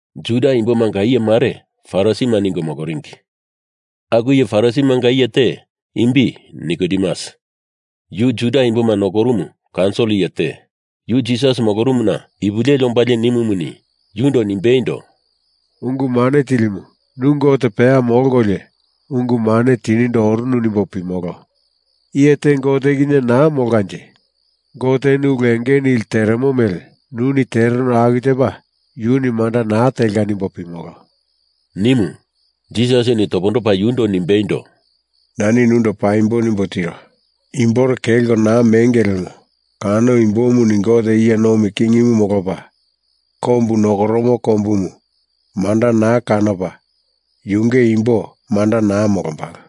Juda imbomanga iye mare Farisima ningo moloringi. Aku iye Farisimanga iye te, imbi Nikodemus, yu Juda imboma nokorumu kaunsil iye te, yu Jisas molorumuna ipu leli ombalie nimumuni, yundo nimbeindo, “Ungu Mane Tilimu, nu Gote peya molkolio ungu mane tinindo orunu nimbo pimolo. Iye te Gote kinye naa molkanje Goteni ulu enge nili teremo mele nuni tereno aku tepa yuni manda naa telka nimbo pimolo,” nimu. Jisasini topondopa yundo nimbeindo, “Nani nundo paimbo nimbo tiro. Imbore kelko naa menge lemo kano imbomuni Goteni iye nomi kingimu molopa kombu nokoromo kombumu manda naa kanopa yunge imbo manda naa molombalo,”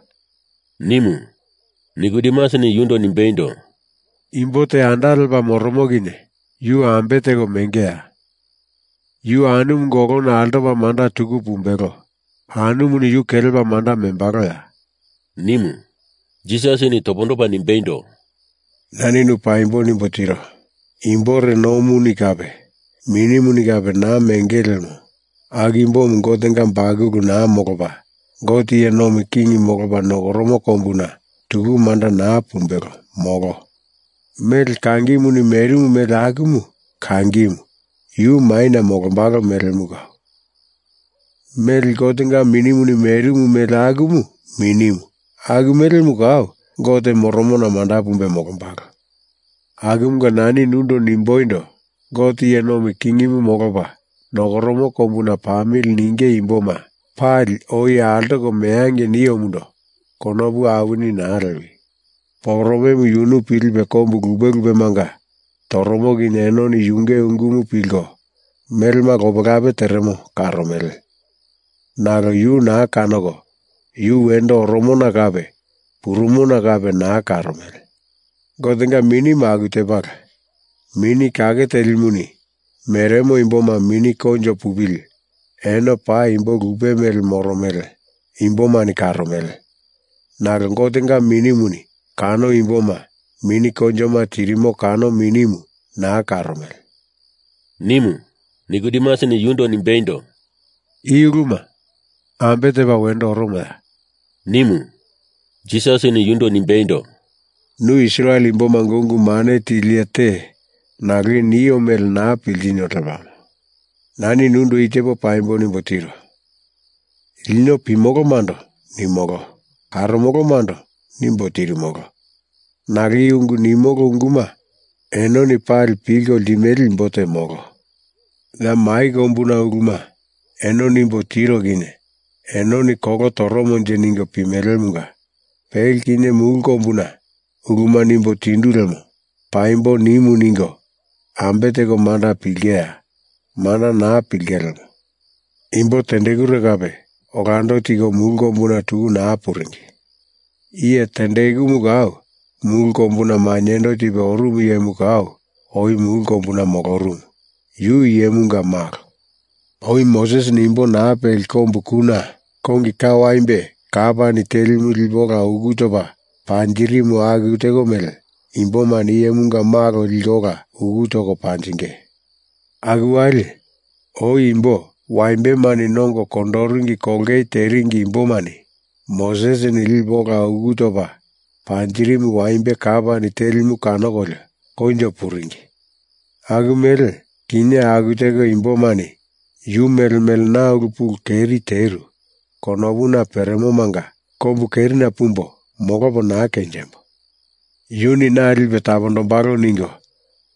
nimu. Nikodemusini yundo nimbeindo, “Imbo te anda lepa moromo kinye yu ambe teko mengeya? Yu anumunga olona altopa manda tuku pumbelo, anumuni yu kelepa manda membaloya?” nimu. Jisasini topondopa nimbeindo, “Nani nu paimbo nimbo tiro. Imbore nomuni kape Minimuni kape naa mengili lemo aku imbomu Gotenga bakulu naa molopa Gote iye nomi King molopa nokoromo kombuna tuku manda naa pumbelo, molo. Mele kangimuni merimu mele, akumu kangimu yu maina molombalo melemu kau. Mele Gotenga Minimuni merimu mele akumu minimu aku melemu kau Gote moromona manda pumbe molombalo. Akumunga nani nundo nimboindo, Gote iye nomi kingimu molopa nokoromo kombuna pamili ninge imboma pali oi altoko meangei niomundo konopu awini naa lewi! Poporomemu yunu pilipe kombu lupe lupemanga toromo kinye enoni yunge ungumu pilko, melema lopelape teremo karomele, nalo yu naa kanoko yu wendo oromona kape purumona kape naa karomele. Gotenga Minimu aku tepala. Mini Kake Telimuni meremo imboma mini koinjo pupili eno paa imbo lupe mele moromele imbomani karomele, nalo Gotenga Minimuni kano imboma mini koinjoma tirimo kano Minimu naa karomele,” nimu. Nikodemusini yundo nimbeindo, “I uluma ambe tepa wendo oromoya?” nimu. Jisasini yundo nimbeindo, “Nu Israel imbomanga ungu mane tili iye te nalo i nio mele naa piltino lepamo. Nani nundo i tepo paimbo nimbo tiro, Lino pimolomando nimolo, karomolomando nimbo tirimolo. Nalo i ungu nimolo unguma enoni pali pilko limele imbo te molo. Ya mai kombuna uluma eno nimbo tiro kinye enoni kolo toromonje ningo pimelemunga pele kinye mulu kombuna uluma nimbo tindu lemo paimbo nimu ningo ambe teko manda pilingeya? Manda naa pilinge lemo. Imbo tendekure kape olando tiko mulu kombuna tuku naa puringi. Iye tendekumu kau, mulu kombuna mainyendo tipe orumu iyemu kau oi mulu kombuna molorumu. Yu Iyemunga Malo. Oi Mosesini imbo naa peli kombu kuna kongi ka waimbe kapani telimu lipe ola uku topa panjirimu aku teko mele imbomani Iyemunga Malo liko ola uku toko panjinge. Aku wali, oi imbo waimbemani nongo kondoringi kolongei teringi imbomani Mosesini lipe ola uku topa panjirimu waimbe kapani telimu kanokolio koinjo puringi aku mele kinye aku teko imbomani yu mele mele na ulu pulu keri teru konopuna peremomanga kombu kerina pumbo molopo naa kenjembo, Yuni na lipe tapondombalo ningo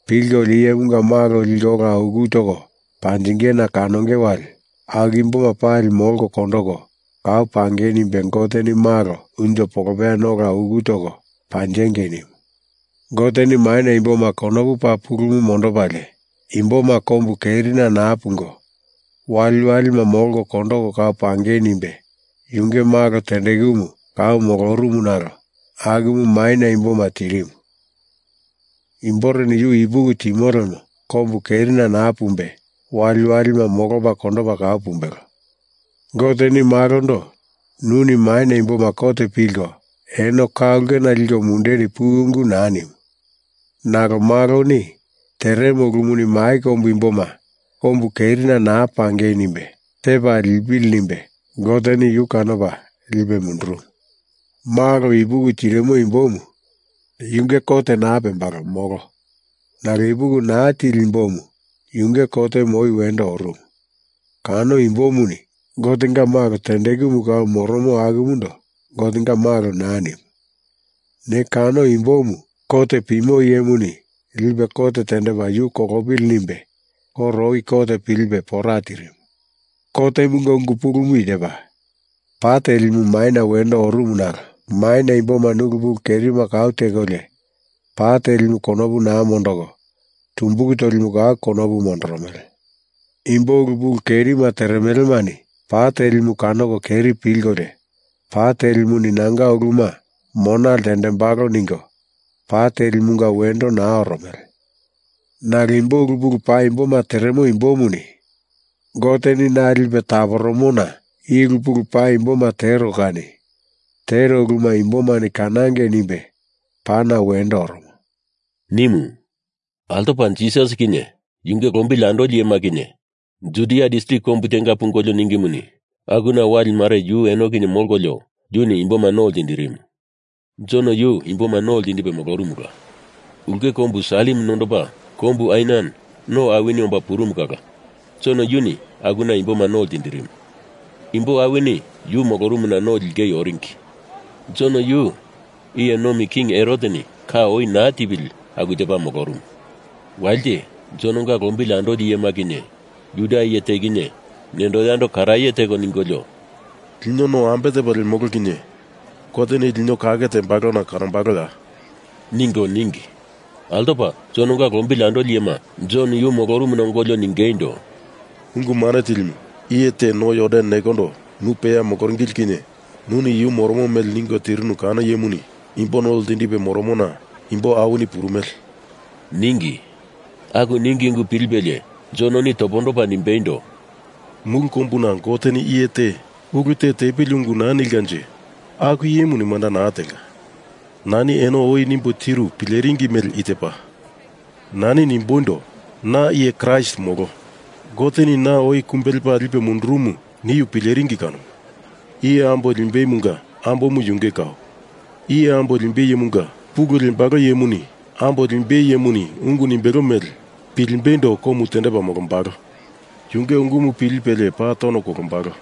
pilkolio Iyemunga Malo liko ola uku toko panjingena kanonge wali, aku imboma pali molko kondoko kau pangei nimbe Goteni Malo unjo polopeyana ola uku toko panjengei nimu. Goteni maina imboma konopu paa pulumu mondopalie imboma kombu kerina naa pungo, waliwalima molko kondoko kau pangei nimbe yunge malo tendekumu kau molorumu nalo akumu maina imboma tirimu. Imboreni Yu ipuki timo lemo kombu kerina naa pumbe waliwalima molopa kondopa kau pumbelo. Goteni Malondo nuni maina imboma kot pilko eno ka ulkena liko mundeni puwi ungu naa nimu. Nalo Maloni teremo ulumuni mai kombu imboma kombu kerina naa pangei nimbe tepa lipili nimbe Goteni yu kanopa lipe mundurumu. Malo ipuki tirimo imbomu yunge kot naa pembalo, molo. Nalo ipuki naa tili imbomu, yunge kotemu oi wendo orumu. Kano imbomuni Gotenga Malo tendekumu kau moromo akumundo Gotenga Malo naa nimu. Ne kano imbomu kot pimo iyemuni lipe kot tendepa yu kolopili nimbe koro oi kot pilipe pora tirimu. Kotemunga ungu pulumu i tepa: Pa telimu maina wendo orumu nalo maina imbomani ulu pulu kerima kau tekolio pa telimu konopu naa mondoko tumbulu tolimu kau konopu mondoromele. Imbo ulu pulu kerima teremelemani pa telimu kanoko keri pilkolio, pa telimuni nanga uluma mona ltendembalo ningo pa telimunga wendo naa oromele. Nalo imbo ulu paimboma teremo imbomuni Goteni na lipe taporomona i ulu pulu paimboma tero kani tero uluma imbomani kanangei nimbe pana wendo oromo,” nimu. Altopa Jisas kinye yunge lombili andoli iyema kinye Judia distrik kombu tenga pungolio ningimuni, akuna wali mare yu eno kinye molkolio, yuni imboma no ltindirimu. Jon yu imboma no ltindipe molorumula. Ulke kombu Salim nondopa kombu Ainan no awini omba purumu kala Jon yuni akuna imboma no ltindirimu. Imbo awini yu molorumuna no lingei oringi. (Jon yu iye nomi king Heroteni ka oi naa tipili aku tepa molorumu.) Walite Jononga lombili andoli iyema kinye Juda iye te kinye nendo yando karaye teko ningolio, “Lino no ambe tepo lemolo kinye Goteni lino kake tembalo kanombaloya?” ningo ningi. Altopa Jononga lombili andolima Jon yu molorumuna ongolio ningeindo, “Ungu Mane Tilimu, iye te no Jordan nekondo nu peya moloringili kinye nuni yu moromo mele ningo tirinu kano iyemuni imbo no ltindipe moromona imbo awini purumele,” ningi. Aku ningi ungu pilipelie Jononi topondopa nimbeindo, “Mulu kombuna Goteni iye te ulu te tepili ungu naa nilkanje aku iyemuni manda naa telka. Nani eno oi nimbo tiru pileringi mele i tepa: Nani nimboindo, na iye Kraist molo, Goteni na oi kumbe lepa lipe mundurumu niu pileringi kanomu. Iye ambo limbeimunga ambomu yunge kau. Iye ambo limbei iyemunga pulu lembalo iyemuni ambo limbei iyemuni ungu nimbelo mele pilimbeindo komu tendepa molombalo. Yunge ungumu pilipelie paa tono kolombalo.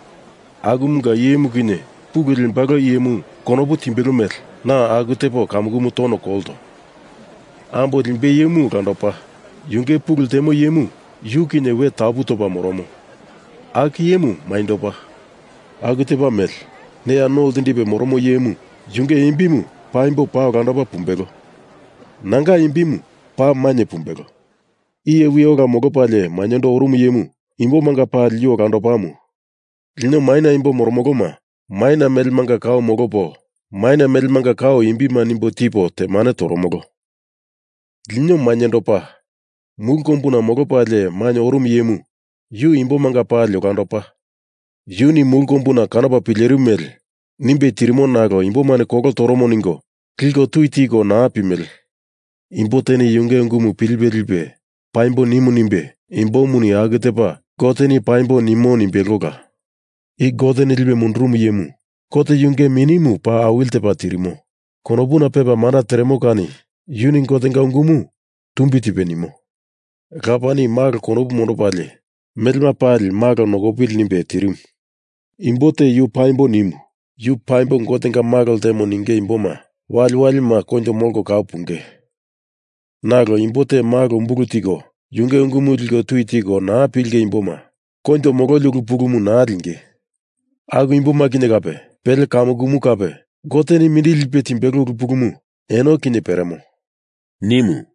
Akumunga iyemu kinye pulu lembalo iyemu konopu timbelo mele na aku tepo kamukumu tono kolto. Ambo limbei iyemu olandopa, yunge pulu ltemo iyemu yu kinye we tapu topa moromo, aku iyemu mainyendopa. Aku tepa mele neya no ltindipe moromo iyemu yunge imbimu paimbo paa olandopa pumbelo. Nanga imbimu paa mainye pumbelo. Iye wi ola molopalie mainyendo orumu iyemu imbomanga pali yu olandopamu. Lino maina imbo moromoloma maina melemanga kau molopo maina melemanga kau imbima nimbo tipo temane toromolo. Lino mainyendopa, mulu kombuna molopalie mainye orumu iyemu yu imbomanga pali olandopa. Yuni mulu kombuna kanopa pilerimu mele nimbe tirimo nalo imbomani kolo toromo ningo liko tui tiko naa pimele. Imbo teni yunge ungumu pilipe lipe paimbo nimu nimbe imbomuni aku tepa Goteni paimbo nimo nimbelola. I Goteni lipe mundurumu iyemu Gote yunge Minimu paa awili tepa tirimo konopuna pepa manda teremo kani yuni Gotenga ungumu tumbi tipe nimo. Lapani Malo konopu mondopalie melema pali Malo nokopili nimbe tirimu. Imbo te Yu paimbo nimu Yu paimbo Gotenga Malo ltemo ninge imboma waliwalima koinjo molko kau punge. Nalo imbo te Malo umbulu tiko yunge ungumu liko tui tiko naa pilinge imboma koinjo mololi ulu pulumu naa linge. Aku imboma kinye kape, pele kamukumu kape Goteni mindili lipe timbelo ulu pulumu eno kinye peremo,” nimu.